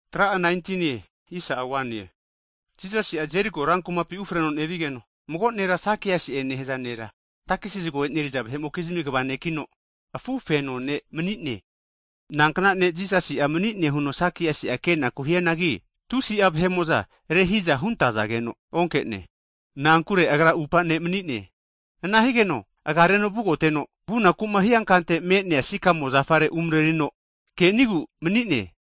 Hagi Jisasi'a Jeriko rankumapi ufreno nevigeno, mago nera Sakiasi'e nehaza nera, takesi zago eneriza vahe'mokizmi kva nekino, afufeno ne' mani'ne. Nankna ne' Jisasi'a mani'ne huno Sakiasi'a kenaku hianagi, tusi'a vahe'mo'za rehiza huntazageno onke'ne. Na'ankure agra atupa ne' mani'ne. Ana higeno agareno vugoteno, vunaku'ma hiankante me'nea sikamo zafare umarerino kenigu mani'ne.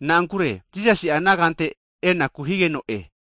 Na'ankure Jisasi'a ana kante enaku higeno'e.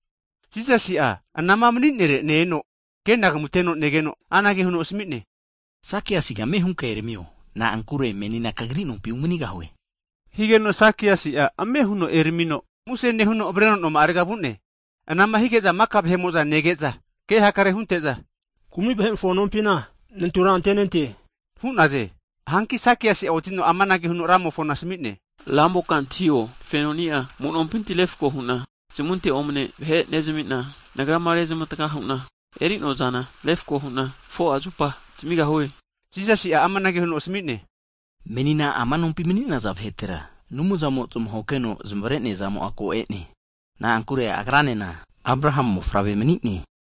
Jisasi'a anama mani'nere ne-eno, kenagamuteno negeno anage huno asami'ne, Sakiasiga ame hunka eramio, na'ankure menina kagri nompi umanigahue. Higeno Sakias'a ame huno eramino, muse nehuno avreno noma'arega vu'ne. Ana'ma hige'za maka vahe'mo'za nege'za, ke hakare hunte'za, kumi vahe'mofo nompina nantura antenente hu'naze. Hanki Sakiasi'a otino amanage huno Ramofona asmi'ne. Ramoka antahio, fenoni'a amu'nompinti refko hu'na zmunte omne vahe nezamina, nagrama rezmatga hu'na eri'noazana refko hu'na 4'a zupa zamigahue. Higeno Jisasi'a amanage huno asami'ne, Menina ama nompi mani'naza vahetera, Anumzamo'a zmahokeno zamavare'neazamo ko e'ne. Na'ankure agranena Abrahamu mofavre mani'ne.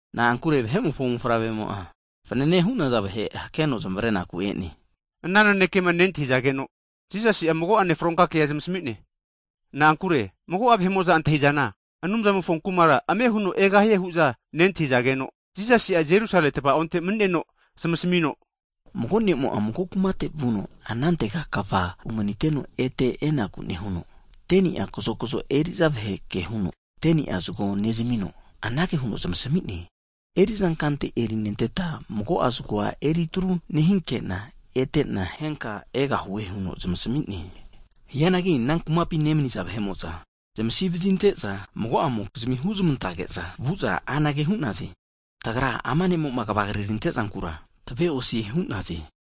Na'ankure vahe'mofo Mofavremo'a, fanane hu'naza vaheku hakeno zamavarenaku e'ne. Ana nanekema nentahizageno, Jisasi'a mago'ane fronka kea zamasami'ne. Na'ankure mago'a vahe'mo'za antahi'zana, Anumzamofo kumara ame huno egahie hu'za nentahizageno, Jisasi'a Jerusalemi tavaonte mani'neno zamasamino, Mago ne'mo'a mago kumatega vuno anantega kva umaniteno ete enaku nehuno, 10ni'a kazokzo eri'za vahe'a kehuno, 10ni'a zago nezamino, anage huno zamasami'ne. Eri'za kante erinenteta mago'a zagoa retro nehinkena etena henka egahue. Hianagi ana kumapi nemaniza vahe'mo'za zamasivazinte'za, mago'amokizmi huzmantage'za vu'za anage hu'naze. Tagra ama ne'mo'ma kvagri rante'zankura tave'osie hu'naze.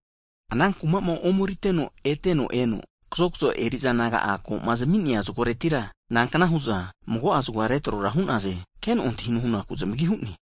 Ana kumama omeriteno ete eno, kazokzo eri'za naga'a koma zami'nea zagoretira, nankna huza mago'a zagoa retrora hu'naze keno antahino hunaku zamagi hu'ne.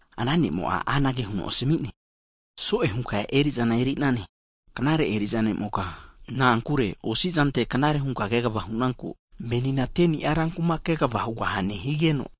ana ne'mo'a anage huno asami'ne, so'e hunka eri'za eri'nane, knare eri'za nemoka, na'ankure osi'zante knare hunka kegava hu'nanku, menina 10ni'a rankuma kegava hugahane higeno,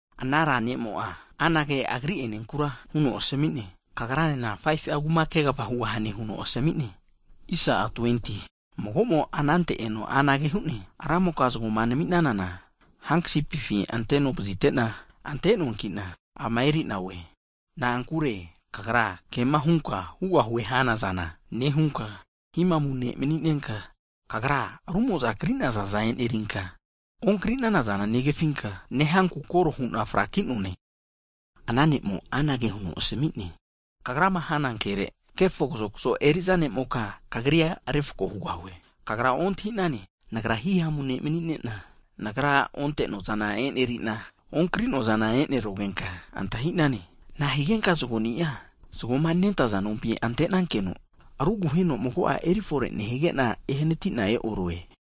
Ana ra ne'mo'a anage agri enenkura huno asami'ne, kagranena 5fu'a kuma kegava hugahane huno asmi'ne. Mago'mo anante eno anage hu'ne, Ramoka, zagoma nami'nanana hankasipifi ante'novzitena ante'noankina ama erina oe. Na'ankure kagra hihamu ne' mani'nenka kema hunka hugahue hanazana nehunka, kagra rumo'za kri'nazaza enerinka, onkrinanazana negafinka nehanku kore hu'na fraki'noane. Ana ne'mo'a anage huno asmi'ne, Kagrama hana kere, kefo kazokzo nemoka kagrira refko hugahue. Kagra ontahi'nane, Nagra himamu ne' mani'nena, nagrama onte'noazana eneri'na, okri'noazana nevasaguana kagra ontahinano? Na'a higenka zagoni'a zagoma nentaza nompi antenankeno, ruguheno mago'a erifore nehigena ehanatina e'orue?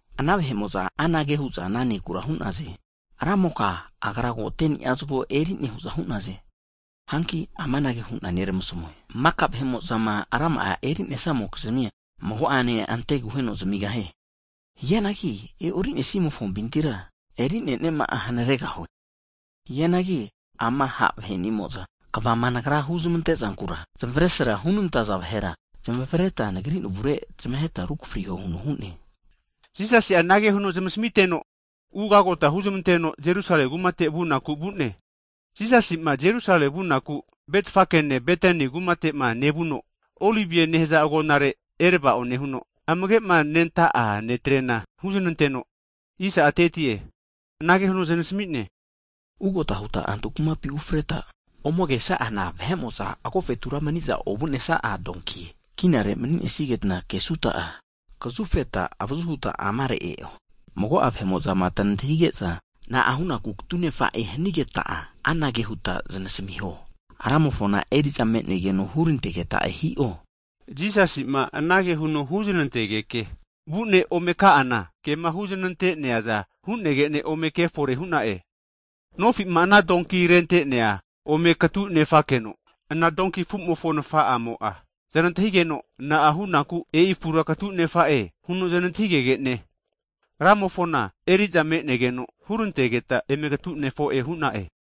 Ana vahe'mo'za anage hu'za ana nekura hu'naze. Ramoka, agra 10ni'a zagoa ko eri'ne hu'za hu'naze. Hanki amanage hu'na neramasamue, maka vahe'mo'zama rama'a erinesamokizmia, mago'ane anteaguheno zamigahie. Hianagi e'orinesimofompintira, erineniama'a hanaregahue. Hianagi ama ha' vahe'nimo'za, kvama nagra huzmantezankura zamesra hunantaza vahera, zamavareta nagri navure zamaheta rukafritreho huno hu'ne. Jisasi'a anage huno zamasmiteno, ugagota huzmanteno Jerusalemi kumate vu'naku vu'ne. Jisasima Jerusalemi vunaku Betfagene Betani kumatema nevuno, Olive nehaze agonare erava'o nehuno, amagema nenta'a disaipol ne'trena huznanteno, anage huno zanasami'ne, Ugota huta antu kumapi ufreta ome kesa'ana, vahe'mo'za agofetura mani'za ovu'nesaza donki afu kinare mani'nesigeta kegaha'anki, kazufeta avazu huta amare e'o. Mago'a vahe'mo'zama tanantahimage'za na'a hunaku katunefa'e? Hanageta anage huta znasamiho, Ramofona eri'za me'negeno hurantegeta'e hi'o. Jisasima anage huno huznantegeke vu'ne ome ka'ana, kema huzanante'neaza hu'negene ome ke fore hu'na'e. Nofi'ma ana donki rentenea ome katu nefakeno, ana donki afu'mofo nafa'amo'a znantahigeno, Na'a hunaku donki afura katu nefa'e? huno znantahigege'ne, Ramofona eri'za me'negeno hurantegeta eme katu nefo'e hu'na'e.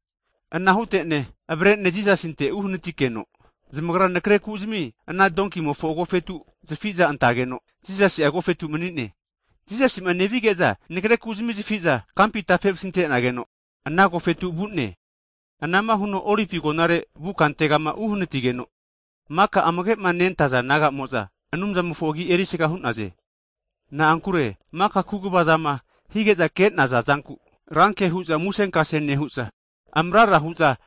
Ana hutene avare'ne Jisasinte uhanatike, zanagra nakre kuzani ana donkimofo agofetu zafike antekeno Jisasi'a agofetu mani'ne. Jisasi'ma nevige'za vahe'mo'za nakrekuzmi zafiza kampi tafe vasinte'nageno ana agofetu vu'ne. Ana'ma huno Olive agonare vu kantema uneramigeno hanatigeno, maka amagema nentaza disaipol naga'mo'za, Anumzamofo agi erisaga hu'naze. Na'ankure maka kaguvazama hige'za ke'naza zanku ranke hu'za musenkase nehu'za amrara hu'za,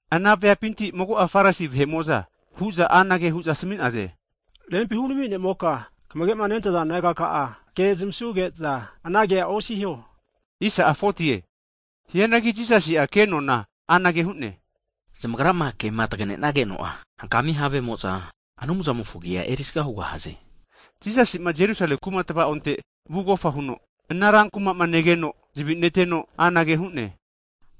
Ana veapinti mago'a Farisi vahe'mo'za anage huza asmi'naze, Rempi hurami nemoka, kamagema nentaza disaipol nagaka'a ke zamasuge'za anage osiho hu'za asami'naze. Hianagi Jisasi'a kenona anage hu'ne, Zamagrama kema taganenageno'a hankami havemo'za, Anumzamofo agi'a erisaga hugahaze! Jisasima Jerusalemi kuma tavaonte vugofa huno, ana ran kuma'ma negeno'a zavi neteno, anage hu'ne,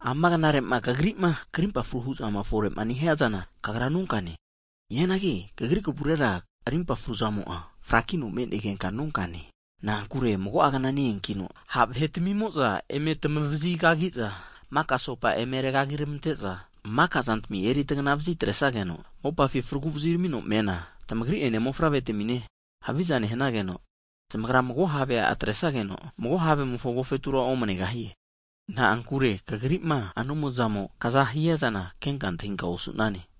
Ama knare'ma kagrima krimpa fruma hu'zama fore'ma nehiazana, kagra nonkane! Hianagi kagri kavurera rimpa fruzamo'a frakino me'negenka nonkane. Na'ankure mago'a kna ne-eankino, ha' vahe'timimo'za eme tamavazi kagiza, maka asopa eme regagi ramante'za, makazantmi eritagna vazi atresigeno, mopafi fragu vaziramino mena, tamagri'ene mofavretamine haviza nehanageno, zamagra mago havea atresageno mago havemofo agofetura omnegahie. Na'ankure kagrima Anumzamo'ma kazama hunaku'ma eazana kenka antahinka osu'nane.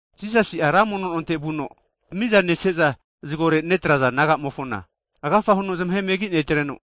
Jisasi'a ra mono nonte vuno, miza neseza zagore netraza nagamofona, agafa huno zamahe megi netreno,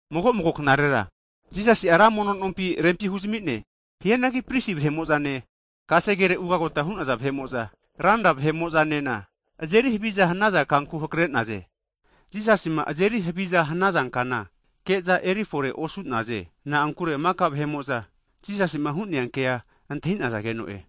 Mago mago knarera Jisasi'a ra mono nompi rempi huzami'ne. Hianagi pristi vahe'mo'zane, kasegere ugagota hu'naza vahe'mo'zane, ranra vahe'mo'zanena azeri haviza hanaza kanku hakre'naze. Jisasima azeri haviza hanaza kana ke'za eri forera osu'naze. Na'ankure maka vahe'mo'za Jisasima hu'nea ke antahi'nazageno'e.